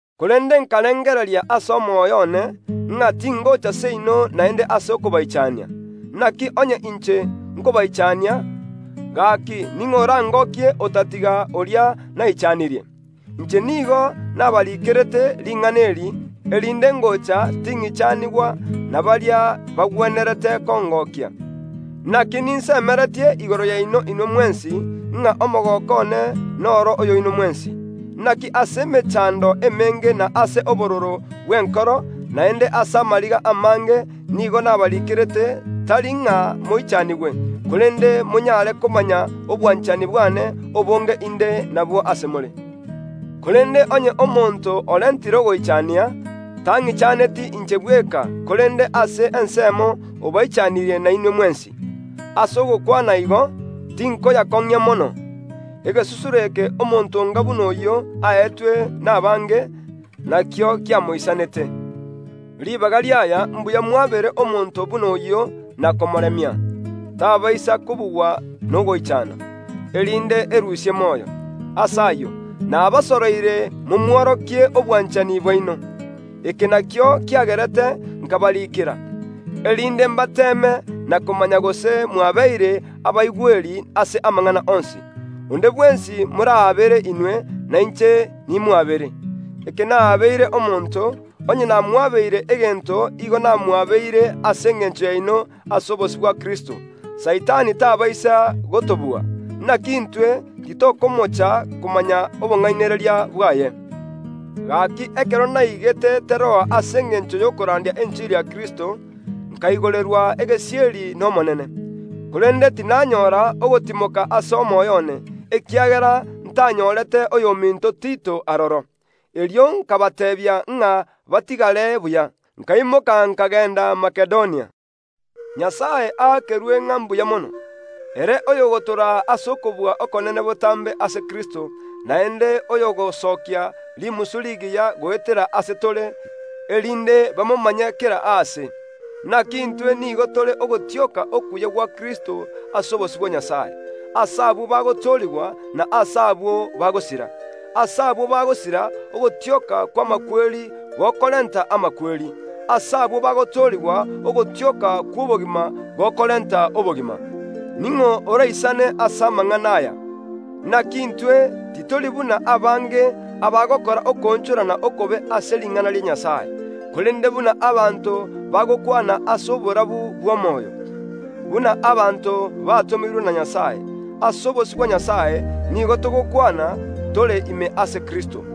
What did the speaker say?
Korende nkarengereria ase omoyo one, ng’a tingocha seino naende ase okobaichania. Naki onye inche nkobaichania, gaki ning’o orangokie, otatiga oria naichanirie? Inche nigo nabaiikerete ring’ana eri, erinde ngocha ting’ichanigwa na baria bagwenerete kongokia, naki ninsemeretie igoro yaino inwe mwensi, ng’a omogooko one noro oyoino mwensi. Naki ase emechando emenge na ase obororo bw’enkoro, naende ase amariga amange nigo nabarikerete, tari ng’a moichanigwe, korende monyare komanya obwanchani bwane obonge inde nabwo ase more. Korende onye omonto orentire ogoichania, tang’ichaneti inche bweka, korende ase ensemo obaichanirie nainwe mwensi. Ase ogokwana igo, tinkoyakong’ia mono. Egesusuro eke omonto onga buna oyio aetwe nabange, nakio kiamoisanete. Ribaga ri’aya mbuya mwabere omonto buna oyio na komoremia, tabaisa kobugwa nogoichana, erinde erusie moyo. Ase ayio nabasoroire momworokie obwanchani bwaino. Eke nakio kiagerete nkabariikera, erinde mbateeme na komanya gose mwabeire abaigweri ase amang’ana onsi. Onde bwensi morabere inwe, nainche nimwabere. Ekero nabeire omonto, onye namwabeire egento igo namwabeire ase engencho yaino ase obosio bwa Kristo, Saitani tabaisa gotobua; naki intwe titokomocha komanya obong’ainereria bwaye. Gaki ekero naigete Teroa ase engencho y’okorandia enchiri ya Kristo, nkaigorerwa egesieri n’Omonene, korende tinanyora ogotimoka ase omoyo one, ekiagera ntanyorete oyominto Tito aroro. Erio nkabateebia ng’a batigare buya, nkaimoka nkagenda Makedonia. Nyasae aakerwe ng’a mbuya mono, ere oyogotoraa ase okobua okonene botambe ase Kristo, naende oyogosokia rimisu rigiya goetera ase tore, erinde bamomanye kera aase. Naki intwe nigo tore ogotioka okuya gwa Kristo ase obosio bwa Nyasae, ase abwo bagotoorigwa, na ase abwo bagosira; ase abwo bagosira ogotioka kw’amakweri gokorenta amakweri; ase abwo bagotoorigwa ogotioka kw’obogima gokorenta obogima. Ning’o oraisane ase amang’ana aya? Naki intwe titori buna abange abagokora okoonchorana okobe ase ring’ana ria Nyasae; korende buna abanto bagokwana ase oborabu bw’omoyo, buna abanto batomirwe na Nyasae. Ase obosio bwa Nyasae, nigo togokwana, tore ime ase Kristo.